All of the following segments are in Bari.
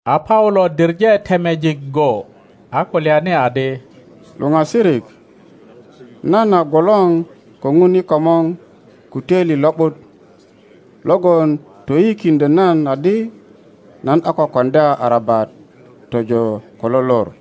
A Paulo diŋe temejik go, a kulyani adi, Luŋasirik, nan a gwolor ko Ŋun i komor ko töili lo ’but logon toyiyikiŋdyö nan adi nan a ko koŋdya arabat tojo ko lo lor.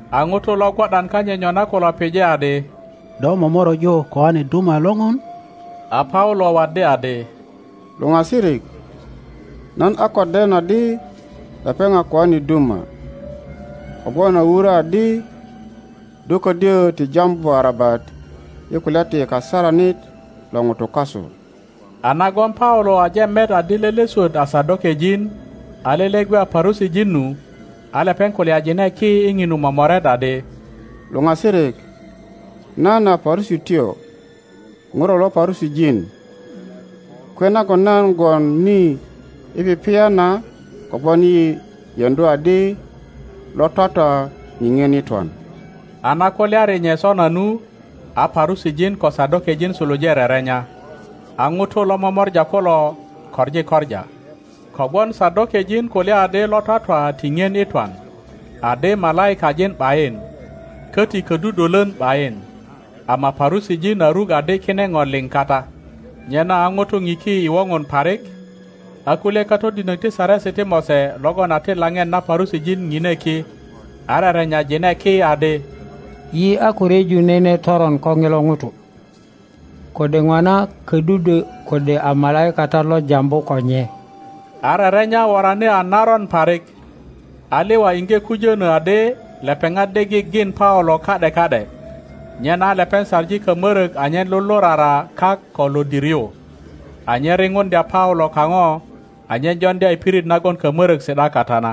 A ŋutu lo gwo ’dan kanyit nyona kulo pije adi, Do momoröju koane duma lo Ŋun? A Paulo waddi adi, Luŋasirik, nan a ko den adi lepeŋ a koane duma; kogwon a wurö adi, Do ködyö ti jambu arabat i kulya ti kasaranit lo ŋutu kasu. A nagon Paulo aje met adi lele swöt a Sadokejin a lele gwe a Parusijin nu, a lepeŋ kulyajine ki i ŋinu momoret adi, Luŋasirik, nan a Parusityo ŋuro lo Parusijin, kwe nagon nan gwon ni i pipiya na kogwon yi yeŋdu adi lo twatwa ŋiŋien i twan. A na kulyari nye sona nu, a Parusijin ko Sadokejin suluje rerenya, a ŋutu lo momora kulo koŋi koŋa. Kogwon Sadokejin kulya adi lo twatwa ti ŋien i twan, adi malaikajin ’bayin, köti ködudwölön ’bayin; ama Parusijin a ruk adi kine ŋo liŋ kata. Nyena a ŋutu ŋiki i woŋon parik, a kulye katodinok ti Saresi ti Mose logon a ti laŋet na Parusijin ŋine ki, a rerenyajine ki adi, Yi a ko ryeju nene toron ko ŋilo ŋuto. Kode ŋona ködudwö kode a malaikatat lo jambu ko nye. a rerenya worani a naron parik, a liwa iŋge kujönö adi lepeŋat de gigin Paulo ka ’de ka ’de, nyena a lepeŋ saŋi kamörök anyen lulurara kak ko lodir yu, anyen riŋuŋdya Paulo kaŋo anyen joŋdya i pirit nagon kamörök si ’da kata na.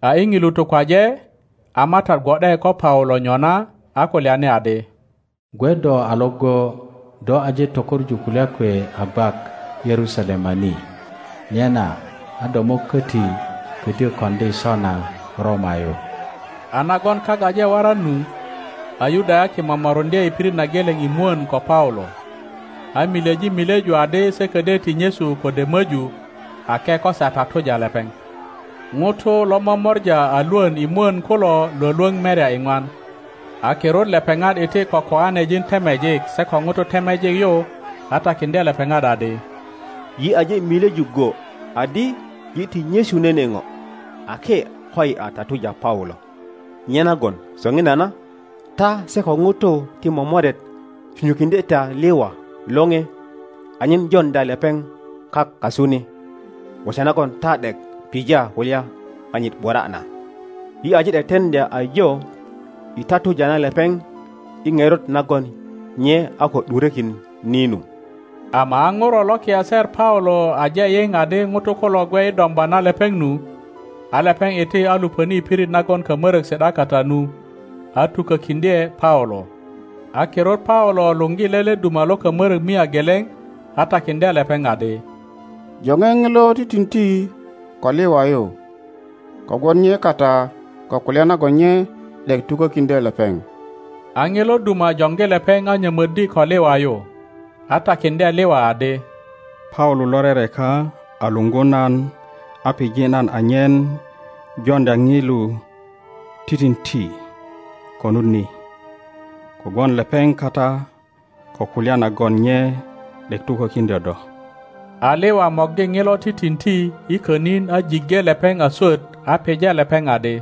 A i ŋilu tukwaje, a Matat gwo ’de ko Paulo nyona, a kulyani adi, Gwe do a iŋgo; do aje tökoŋu kulya kwe a gwak Yerusalema ni, nyena a do mo köti ködyö koŋdi sona Roma yu. A nagon kak aje waran nu, a Yudayaki momoruŋdye i pirit na geleŋ i mwön ko Paulo, a milyeji milyeju adi se ködyö ti nyesu kode möju ake ko se a tatuja lepeŋ. Ŋutu lo momora a lwön i mwön kulo lwölwöŋ merya iŋwan. A kirut lepeŋat iti ko koanejin temejik se ko ŋutu temejik yu a takiŋdye lepeŋat adi, Yi aje milyeju go adi yi ti nyesu nene ŋo ake koyi a tatuja Paulo. Nyenagon soŋinana ta se ko ŋutu ti momoret sunyukiŋdye ta liwa lore anyen joŋdya lepeŋ kak kasu ni, gwoso nagon ta ’dek pija kulya kanyit ’bura na. Yi aje teteŋdya ajo i tatuja na lepeŋ i ŋerot nagon nye a ko ’durökin ni nu. Ama a ŋuro lo kiaser Paulo aje yiŋ adi ŋutu kulo gwe i domba na lepeŋ nu, a lepeŋ iti a luŋöni i pirit nagon kamörök si ’da kata nu, a tukökiŋdye Paulo. A kirut Paulo luŋgi lele duma lo kamörök mia geleŋ a takiŋdye lepeŋ adi, Joŋe ŋilo titinti ko liwa yu, kogwon nye kata ko kulya nagon nye ’dek tukökiŋdyö lepeŋ. A ŋilo duma joŋgi lepeŋ a nyömöddi ko liwa yu, a takiŋdye liwa adi, Paulo lo rereka a luŋgu nan a pije nan anyen joŋdya ŋilo titinti konut ni, kogwon lepeŋ kata ko kulya nagon nye ’dek tukökiŋdyö do. A liwa morgi ŋilo titinti i könin a jiŋge lepeŋ a swöt, a pije lepeŋ adi,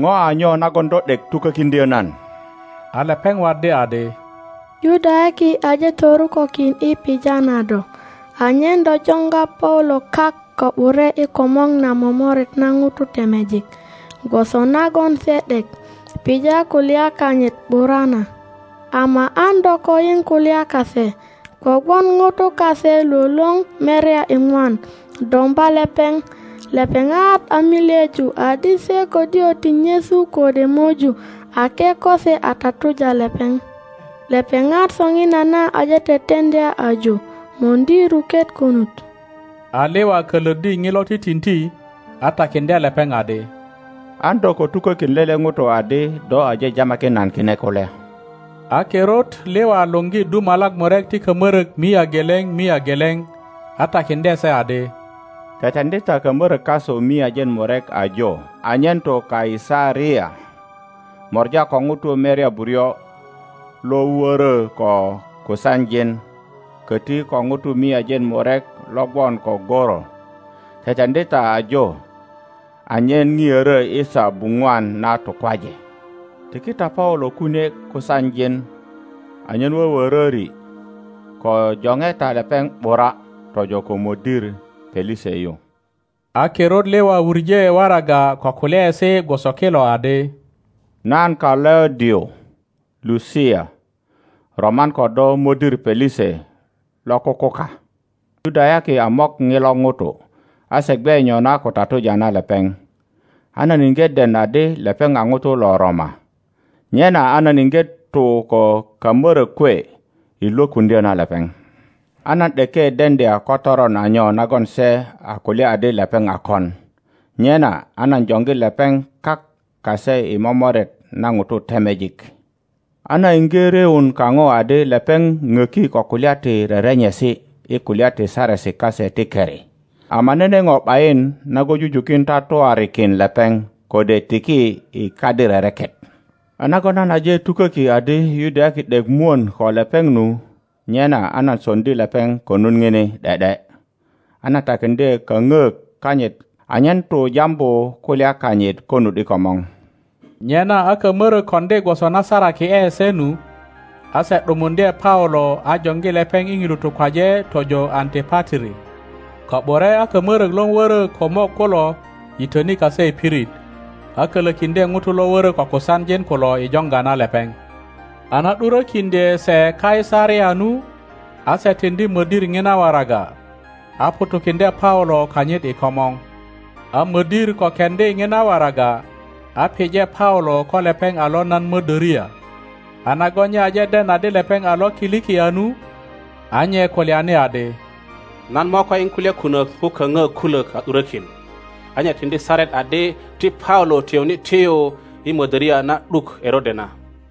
Ŋo a nyo nagon do ’dek tukökiŋdyö nan? A lepeŋ waddi adi, Yudayaki aje torukökin i pija na do anyen do joŋga Paulo kak ko ’bure i komŋo na momoret na ŋutu temejik, gwoso nagon se ’dek pija kulya kanyit ’bura na! Ama an do ko yiŋ kulya kase, kogwon ŋutu kase lwölwöŋ merya iŋwan domba lepeŋ. Lepeŋat a milyeju adi se ködyö ti nyesu kode möju ake ko se a tatuja lepeŋ. Lepeŋat soŋinana aje teteŋdya ajo möŋdi ruket konut. A liwa kölöddi ŋilo titinti, a takiŋdye lepeŋ adi, An do ko tukökin lele ŋuto adi do aje jamakin nan kine kulya. A kirut liwa luŋgi dumalak murek ti kamörök mia geleŋ mia geleŋ, a takiŋdye se adi, Teteŋdi ta kamörök kasu miajin murek ajo anyen tu Kaisaria mora ko ŋutu merya buryo lo wörö ko kusanjin, köti ko ŋutu miajin murek lo gwon ko goro. Teteŋdi ta ajo anyen ŋiörö i saa buŋwan na tukwaje. Tiki ta Paulo kunie kusanjin anyen wöwöröri, ko joŋe ta lepeŋ ’bura tojo ko mödir Pelise yu. a kirut liwa wuŋe waraga ko kulyaesi gwoso kilo adi, Nan Kalaudio Lusia roman ko do mödir Pelise lo kukuka. Yudayaki a mok ŋilo ŋuto, a se gwe nyona ko tatuja na lepeŋ, a nan iŋge den adi lepeŋ a ŋuto lo Roma, nyena a nan iŋge tu ko kamörök kwe i lwökuŋdyo na lepeŋ. a nan ’deke deŋdya ko toron a nyo nagon se a kulya adi lepeŋ a kon. Nyena a nan joŋgi lepeŋ kak kase i momoret na ŋutu temejik. A nan iŋge ryöun kaŋo adi lepeŋ poki ko kulya ti rerenyesi i kulya ti Saresi kase ti keri, ama nene po ’bayin nagon jujukin tatuarikin lepeŋ kode tiki i kadi rereket. A nagon nan aje tuköki adi Yudayaki ’dek mwön ko lepeŋ nu, nyena a nan soŋdi lepeŋ konut ŋini ’de ’de, a nan takiŋdye kaöŋök kanyit anyen tu jambu kulya kanyit konut i komor. Nyena a kamörök koŋdi gwoso na saraki ’e se nu, a se ’dumuŋdye Paulo a joŋgi lepeŋ i ŋilu tukwaje tojo Antipatri. Ko ’bure a kamörök lo wörö ko mok kulo yitöni kase i pirit, a kölökiŋdye ŋutu lo wörö ko kusanjin kulo i joŋga na lepeŋ. a na ’durökiŋdye se Kaisaria nu, a se tiŋdi modir ŋina waraga, a ŋutukiŋdye Paulo kanyit i komor. A mödir ko keŋdi ŋina waraga, a pije Paulo ko lepeŋ a lo nan mödöria, a nagon nye aje den adi lepeŋ a lo Kilikia nu, a nye kulyani adi, Nan mo ko yiŋ kulya kunök ko kaöŋök kulök a ’durökin. A nye tiŋdi saret adi ti Paulo tiyuni tiyu i mödöria na ’duk Erode na.